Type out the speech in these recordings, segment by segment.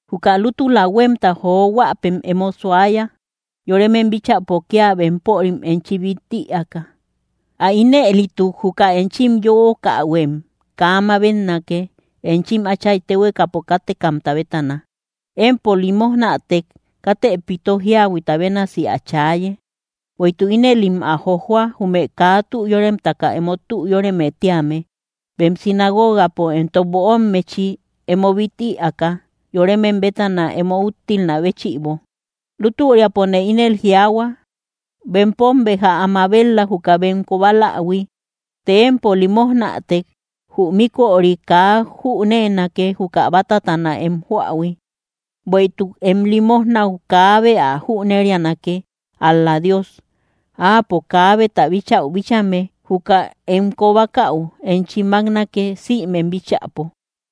’Juka lútula huémta johuäpem emo suaya yoremem bíchäpo kía bempörim enchim bít ïaaka. Ä ínëlituk juka enchim yöokahuem kaa mabetnake, enchim Áchay téhuekapo kátekamta bétana. Empo limojnätek, katë pito jíahuita bénasi ä chaaye, bueïtuk ínëlim ä jojoa, jume kaa tü yoremtaka emo tü yóreme tíame, bem sinagogapo entok böommechi emo bít ïaaka, yoremem bétana emo úttilnä béchïbo. Lútüriapone ínel jiaahua, bempom béja ä mabet‑la, juka bem kobalähui. Të empo limojnätek, jü míköri kaa jüneenake, juka bátatana em joähui. Bueïtuk em limojnäu kaabe ä jüneríanake; ál‑la Dios, Áapo kaabeta bíchäu bíchame, juka em kobakäu enchi máknake, sïmem bíchäpo.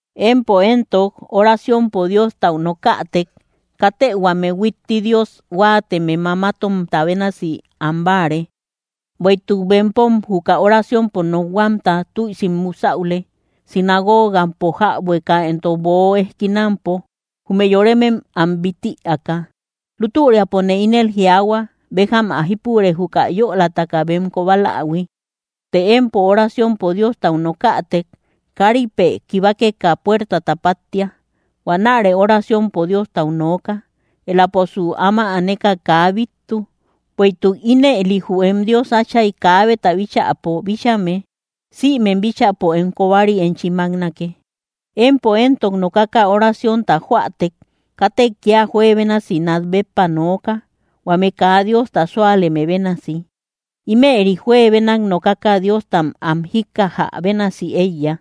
’Empo éntok oraciompo Diostau nokätek, katë huame huitti Dios huáateme mamatomta bénasi am báare; bueïtuk bempom juka oraciompo nokhuamta tüisi musäule, sinagogampo jäbueka entok böo ejkinampo, jume yoremem am bít ïaaka. Lútüriapone ínel jiaahua, béjam ä jípure juka yölataka bem kobalähui. Të empo, oraciompo Diostau nokätek, káripë kibakeka, puertata páttia. Huanärë oraciompo Diostau nooka. Éläposu áma aneka kaa bíttu, bueïtuk ínëli jü em Dios Áchay kaabeta bíchäpo bíchame, sïmem bíchäpo em kobari enchi máknake. ’Empo éntok nokaka oraciónta joätek, katë kía juebénasi nát béppa nooka, huame kaa Diosta súaleme bénasi; ímëri juebenak nokaka Diostam am jíkkajä bénasi éiya.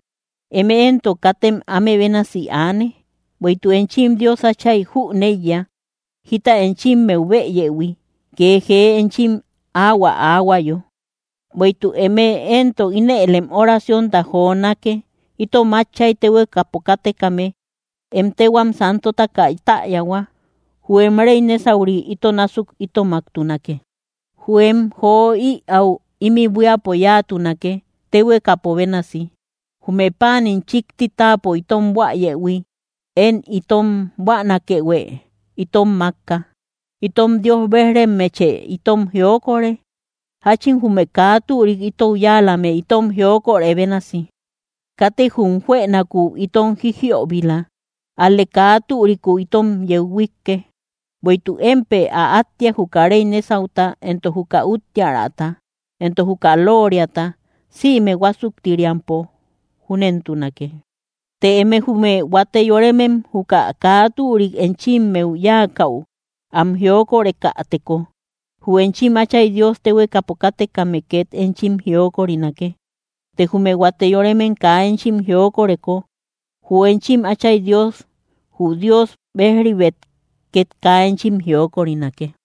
Eme éntok katem áme bénasi aane, bueïtuk enchim Dios Átchay jüneiya jita enchimmeu bëyëhui, kee jee enchim áhuä aahuayo. Bueïtuk eme éntok, ínëlem oraciónta jonake: Itom Átchay téhuekapo kátekame, em téhuam santotaka täyahua. Jü em réy nésauri ito násuk itomaktunake; jü em jo ïäu ímï buíapo yáatunake, téhuekapo bénasi. Jume páanim chíkti táapo itom buäyëhui, én itom buänakëhue itom mákka. Itom Dios bejrimmeche itom jiokore, jáchin jume kaa türik itou yáalame, itom jiokorë bénasi. Katë jum juënakuu itom jijiöbila, ál‑lë kaa türiku itom yeu huíkke. Bueïtuk émpë ä áttiak, juka réy nésauta entok juka úttiäraata, entok juka looriata, sïme huásuktiriampo. Júnentunake. ’Të eme jume huate yoremem, juka kaa türik enchimmeu yáakäu, am jiokorekäteko, jü enchim Áchay Dios téhuekapo kátekame két enchim jiokorinake. Të jume huate yoremem kaa enchim jiokoreko, jü enchim Áchay Dios jü Dios bej‑ribet, két kaa enchim jiokorinake.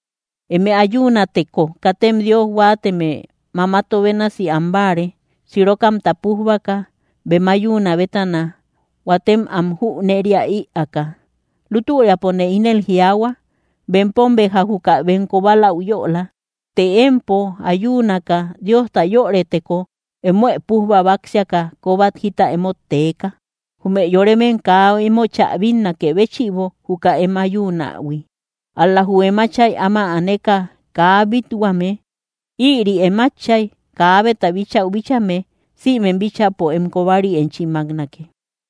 ’Eme ayuunäteko, katem Dios huáateme mamato bénasi báare, sirokamta pújbaka, bem ayuunä bétana huatem am jüneria ïaaka. Lútüriapone ínel jiaahua, bempom béja juka bem kobaläu yöla. Të empo ayuunaka Diosta yörëteko, emoë pújba báksiaka kóbat jita emót teeka, jume yoremem kaa emochä bínnakë béchïbo juka em ayuunähui; ál‑la jü em Áchay áma aneka kaa bít-huame. Ïri em Áchay kaabeta bíchäu bíchame, sïmem bíchäpo em kobari enchi máknake.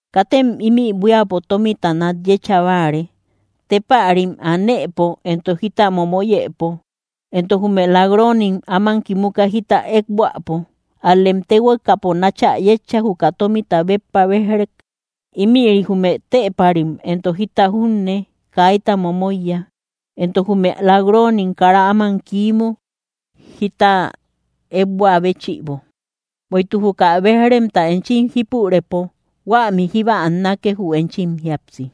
’Katem ímï buíapo tómita nat yécha báare, téepärim anëpo entok jita momoyëpo, entok jume lak‑roonim áman kimuka jita ëekbuäpo. Ál‑lem téhuekapo náchä yétcha juka tómita béppa béj‑rek; ímïri jume téepärim entok jita junne kaitam momoiya, entok jume lak‑roonim kara áman kiimu jita ékbuä béchïbo. Bueïtuk juka béj‑remta enchim jípurëpo, huämi jíba annake jü enchim jíapsi.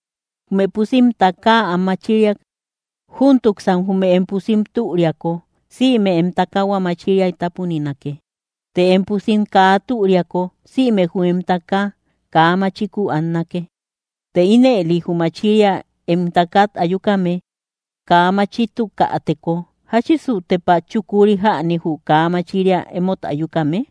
’Jume pusim, takaa am machiriak; júntuksan jume em pusim türiako, sïme em takahua machiriay tápuninake. Të em pusim kaa türiako, sïme jü em takaa kaa machikuu annake. Të ínëli jü machiria em takat ayukame kaa machitukäteko, ¿jáchisu tepa chukuri jäni jü kaa machiria emót ayukame?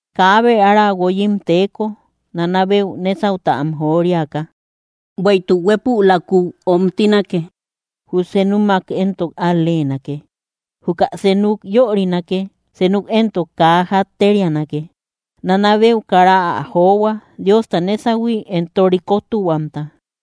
’Kaabe ára guoyim teeko, nana beu nésauta am joriaka, bueïtuk huépülakuu öomtinake jü senumak éntok al-leenake. Juka senuk yörinake; senuk éntok kaa jatterianake. Nana beu kara ä johua Diosta nésahui entok rikotuhuamta.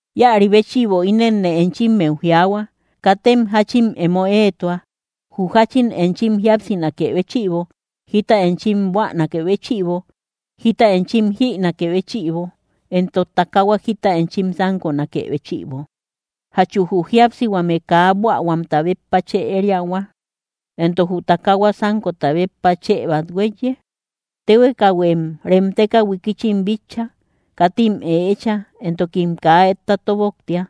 ’Íäri béchïbo, ínenne enchimmeu jiaahua: Katem jáchin emo éetua jü jáchin enchim jíapsinakë béchïbo, jita enchim buänakë béchïbo, jita enchim jïnakë béchïbo, entok takaahuat jita enchim sánkonakë béchïbo. ¿Jachu jü jíapsihuame kaa buähuamta béppa chë ériahua, entok jü takahua sánkota béppa chë bát huéiye? Téhuekahuem remteka huikichim bitcha: Katim ëecha entokim kaa etta tóboktia.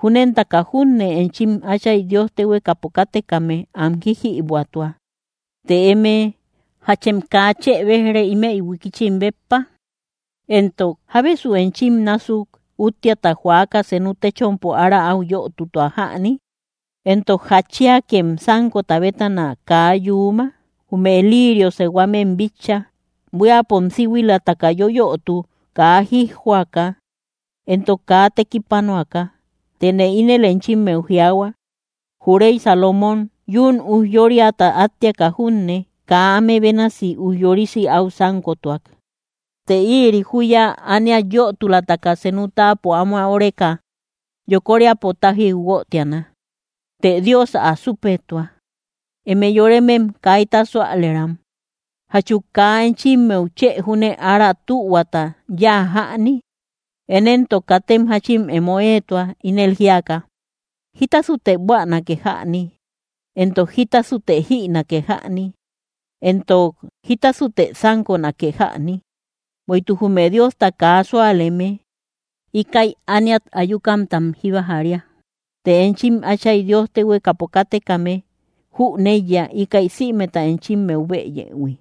Júnentaka junne enchim Áchay Dios téhuekapo kátekame am jíjïbuätua. Të eme, ¿Jachem kaa chë béj‑re, ímëi huikichim béppa? Entok, ¿Jábesu enchim násuk úttiata joaka senu téchompo ára áu yötutua jäni? ’¿Entok jatchiakem sánkota bétana kaa yuuma? Jume liirio sehuamem bitcha: Buíapom síhuilataka yoyötu, kaa jijjoaka entok kaa tekipanuaka. Tëne ínel enchimmeu jiaahua, jü réy Salomón yún ujyóriata áttiaka junne kaa áme bénasi ujyorisi áu sánkotuak. Të ïri júya ániat yötulataka senu táapo áma óreka yokoríapo tájiu guötiana; të Dios ä súpetua. ¡Eme yoremem kaita súalëram! ¿Jachu kaa enchimmeu chë júne ára tühuata yáa jäni? Én éntok katem jáchin emo éetua, ínel jíaka: “¿Jítasute buänake jäni?” entok, “¿Jítasute jïnake jäni?” entok, “¿Jítasute sánkonake jäni?” Bueïtuk jume Diosta kaa súaleme, íkäi ániat ayukamtam jíba jária; të enchim Áchay Dios téhuekapo kátekame jüneiya, íkäi sïmeta enchimmeu bëyëhui.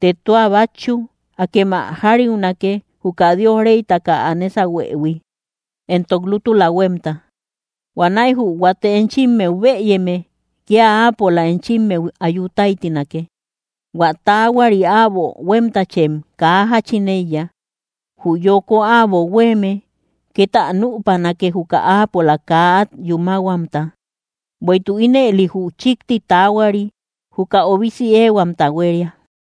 Të tua bátchu, akem ä jariunake, juka Dios réytaka ä nésahuëhui, entok lútula huémta; huanäi jü huate enchimmeu bëyeme, kía áapola enchimmeu ayu táytinake. Huä taahuari äbo huémtachem kaa jáchin éiya; jü yoko äbo huéeme két ä nüpanake, juka áapola kaa át yúmahuamta. Bueïtuk ínëli jü chíkti taahuari juka obisi éehuamta huéria.